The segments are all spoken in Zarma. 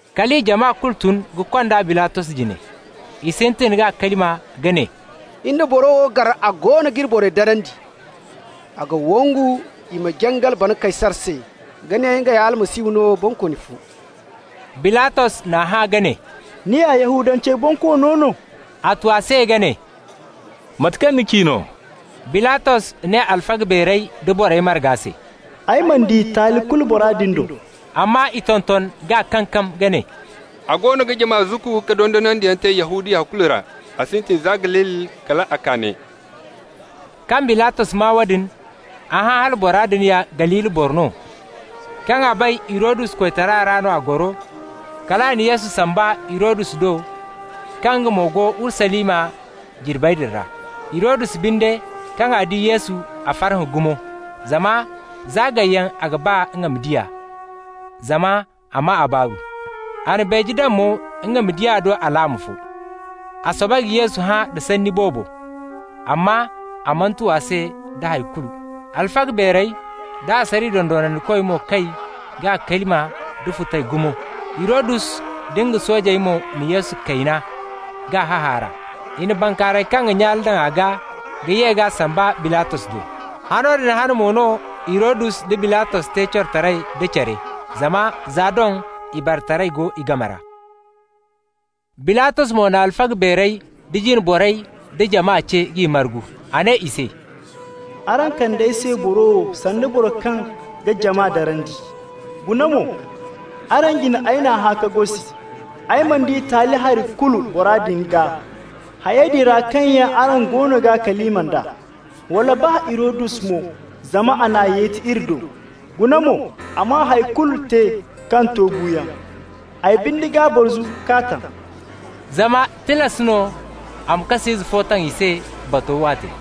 Kala i jama kulu tun ka kond'a Bilatos jine. I sintin k'a kalima ka ne: «Iri na boro wo gar a goono g'iri borey darandi. A ga wangu i ma jangal bana Kaysar se, ga ne nga ya Almasihu no, bonkooni fo.» Bilatos n'a hã ka ne: «Ni ya Yahudancey bonkoono no?» A tu a se ka ne: «Mate kaŋ ni ci no.» Bilatos ne alfaga beerey da borey marga se: «Ay mana di taali kulu bora din do.» Amma i tonton k'a kankam ka ne: «A goono ga jama zukku ka dondonandiyaŋ te Yahudiya kulu ra. A sintin za Galili kal a kaa ne.» Kaŋ Bilatos maa woodin, a hã hala bora din ya Galili boro no. Kaŋ a bay Hirodus koytara ra no a goro, kal a na Yesu samba Hirodus do, kaŋ nga mo go Urusalima jirbey din ra. Hirodus binde, kaŋ a di Yesu, a farhã gumo, zama za gayyaŋ a ga ba nga ma di a, zama a maa a baaru. A na beeje daŋ mo nga ma di a do alaama fo. A soobay ka Yesu hã da sanni boobo, amma a mana tu a se da hay kulu. Alfaga beerey da asariya dondonandikoy mo kay k'a kalima nda futay gumo. Hirodus da nga soojey mo na Yesu kayna k'a hahaara. I na bankaaray kaŋ ga nyaale daŋ a gaa ka ye k'a samba Bilatos do. Hano din hane mo no Hirodus da Bilatos te corotaray da care, zama za doŋ ibaretaray go i game ra. Bilatos mo na alfaga beerey da jine borey da jama ce k'i margu. A ne i se: «Araŋ kand'ay se boro wo sanda boro kaŋ ga jama darandi. Guna mo, araŋ jine ay n'a hã ka gosi. Ay mana di taali hari kulu bora din gaa, hayey din ra kaŋ yaŋ araŋ goono g'a kalima nd'a. Wala baa Hirodus mo, zama a n'a yeti iri do. Guna mo, a mana hay kulu te kaŋ to buuyaŋ. Ay binde g'a barzu k'a taŋ.» Zama tilas no a ma kas'ize fo taŋ i se batog waate.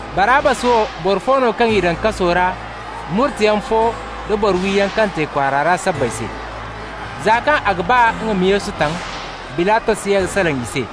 (Barabbas wo boro fo no kaŋ i daŋ kaso ra murteyaŋ fo da boro-wiyaŋ kaŋ te kwaara ra sabbay se.) Za kaŋ a ga ba nga ma Yesu taŋ, Bilatos ye ka salaŋ i se.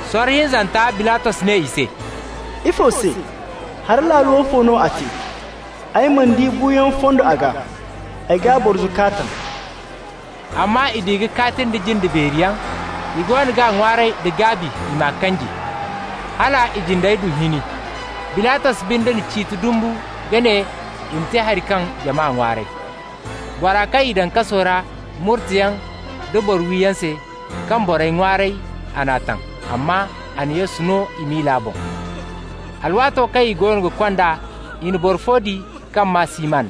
Sorro hinzanta Bilatos ne i se: «Ifo se? Hari laalo woofo no a te? Ay mana di buuyaŋ fondo a gaa. Ay g'a barzu k'a taŋ.» Amma i di ka kaati nda jinde beeri yaŋ, i goono g'a ŋwaaray da gaabi i m'a kanji. Hala i jindey du hini. Bilatos binde na ciiti dumbu ka ne i ma te haŋ kaŋ jama ŋwaaray. Bora kaŋ i daŋ kaso ra murteyaŋ da boro-wiyaŋ se, kaŋ borey ŋwaaray, a n'a taŋ, amma a na Yesu no i miila boŋ. Alwaato kaŋ i goono ga kond'a, i na boro fo di kaŋ maa Siman,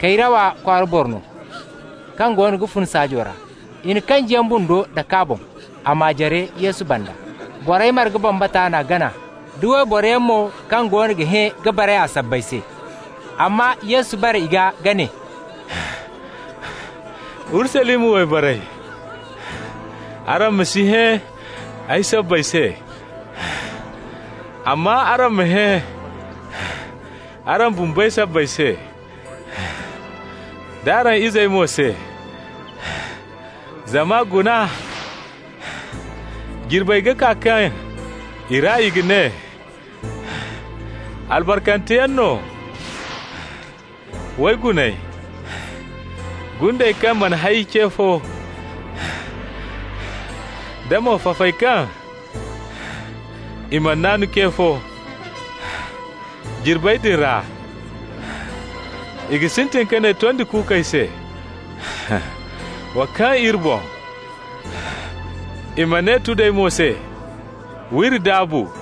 Kayrawa kwaara boro no, kaŋ goono ga fun saajo ra. I na kanjiyaŋ bundo dak'a boŋ, a m'a jare Yesu banda. Borey marga bambata n'a gana, da wayboroyaŋ mo kaŋ goono ga hẽ ka baray a sabbay se. Amma Yesu bare i gaa ka ne: «Urusalima wayborey, araŋ ma si hẽ ay sabbay se, amma araŋ ma hẽ araŋ bumbey sabbay se, d'araŋ izey mo se. Zama guna, jirbey ga kaa kaŋ i ra i ga ne: ‹Albarkanteyaŋ no wayguney: gundey kaŋ mana hay ce fo, da mo fafey kaŋ i mana naanu ce fo.› Jirbey din ra i ga sintin ka ne tondi kuukey se: ‹Wa kaŋ iri boŋ!› I ma ne tudey mo se: ‹W'iri daabu!›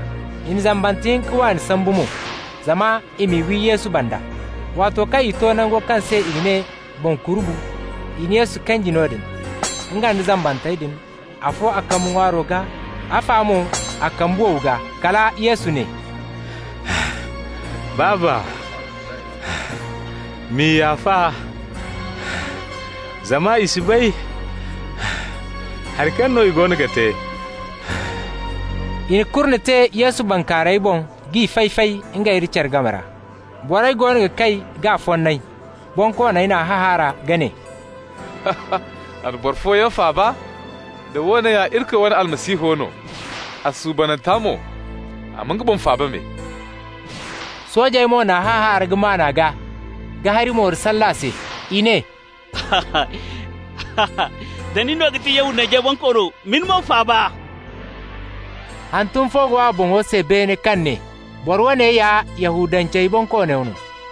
I na zambante hinka waani sambu mo, zama i m'i wi Yesu banda. Waato kaŋ i to nango kaŋ se i ga ne Boŋ Kurubu, i na Yesu kanji noodin, nga nda zambantey din, afo a kambe ŋwaaro gaa, afa mo a kambe wow gaa. Kala Yesu ne: «Baaba, m'i yaafa, zama i si bay hari kaŋ no i goono ga te.» I na kurne te Yesu bankaarayey boŋ k'i fay-fay ngey nda care game ra. Borey goono ga kay k'a fonnay. Bonkooney n'a hahaara ka ne: «A na boro fooyaŋ faaba. Da woone ya Irikoy wane Almasihu no, a suubananta mo, a ma nga boŋ faaba me.» Soojey mo n'a hahaara ka maan a gaa ka hari mooro salle a se. I ne: «Da nin no ga ti Yahudancey Bonkoono, ma ni boŋ faaba.» Hantum fo go a boŋo se beene kaŋ ne: BORO WOONE YA YAHUDANCEY BONKOONO NO.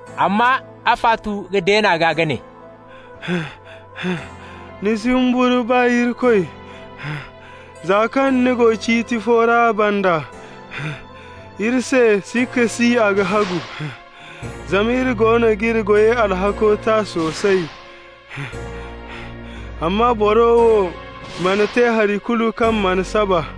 Amma afa tu ka deen'a gaa ka ne: «Ni si humburu baa Irikoy, za kaŋ ni go ciiti fo ra a banda? Iri se, sikka si a ga hagu, zama iri goono g'iri goyey alhakko ta soosay. Amma boro wo mana te hari kulu kaŋ mana saba.»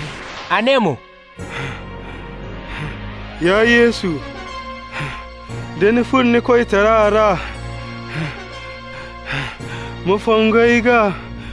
A ne mo: «Ya Yesu, da ni furo ni koytara ra, ma fongu ay gaa.»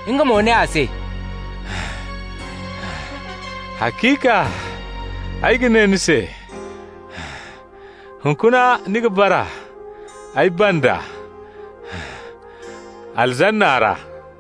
Nga mo ne a se: «Haciika ay ga ne ni se: hunkuna ni ga bara ay banda Paradiso ra.»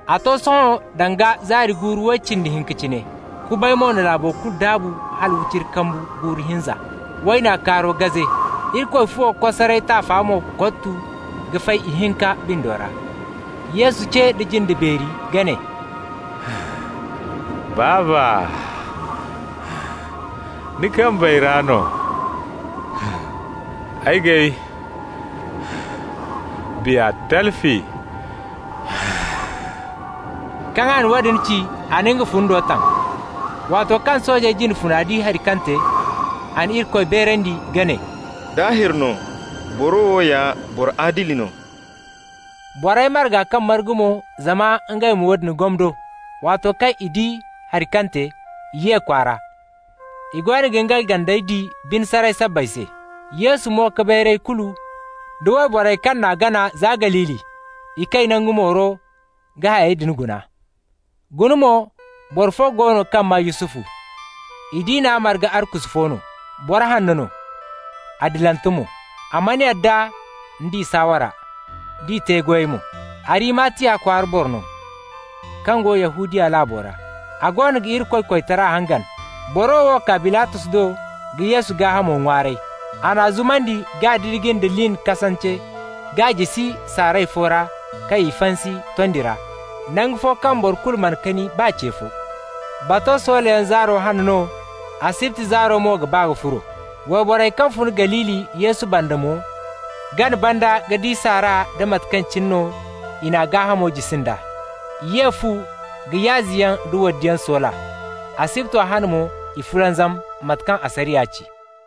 A to sohõ danga zaari guuru way cindi hinka cine. Kubay mo na laabo kulu daabu hala wiciri kambu guuru hinza. Wayna kaaro gaze, Irikoy fuwo kosaray taafa mo kottu ka fay ihinka bindo ra. Yesu ce nda jinde beeri ka ne: «Baaba, ni kambey ra no ay g'ay biya talfi!» Kaŋ a na woodin ci, a na nga fundo taŋ. Waato kaŋ sooje jine funa di hari kaŋ te, a na Irikoy beerandi ka ne: «Daahir no, boro wo ya boro adili no.» Borey marga kaŋ margu mo zama ngey ma woodin gomdo, waato kaŋ i di hari kaŋ te, i ye kwaara, i goono ga ngey gandey di bine saray sabbay se. Yesu mo-ka-bayrayey kulu, da wayborey kaŋ n'a gana za Galili, i kay nangu mooro ka hayey din guna. Guna mo, boro fo go no kaŋ maa Yusufu, i diina marga arkusu fo no, boro hanno no, adilante mo. A mana yadda nd'i saawara nd'i te-goyey mo. Arimatiya kwaara boro no, kaŋ go Yahudiya laabo ra; a goono ga Irikoy koytara hangan. Boro wo kaa Bilatos do ka Yesu gaahamo ŋwaaray. A n'a zumandi k'a didiji nda lin kasance k'a jisi saaray fo ra kaŋ i fansi tondo ra, nangu fo kaŋ boro kulu mana kani baa ce fo. Bato soolayaŋ zaaro hane no, asibti zaaro mo ga ba ka furo. Wayborey kaŋ fun Galili Yesu banda mo gana banda ka di saara da mate kaŋ cine no i n'a gaahamo jisi nd'a. I ye fu ka yaaziyaŋ nda waddiyaŋ soola. Asibto hane mo i fulanzam, mate kaŋ asariya ci.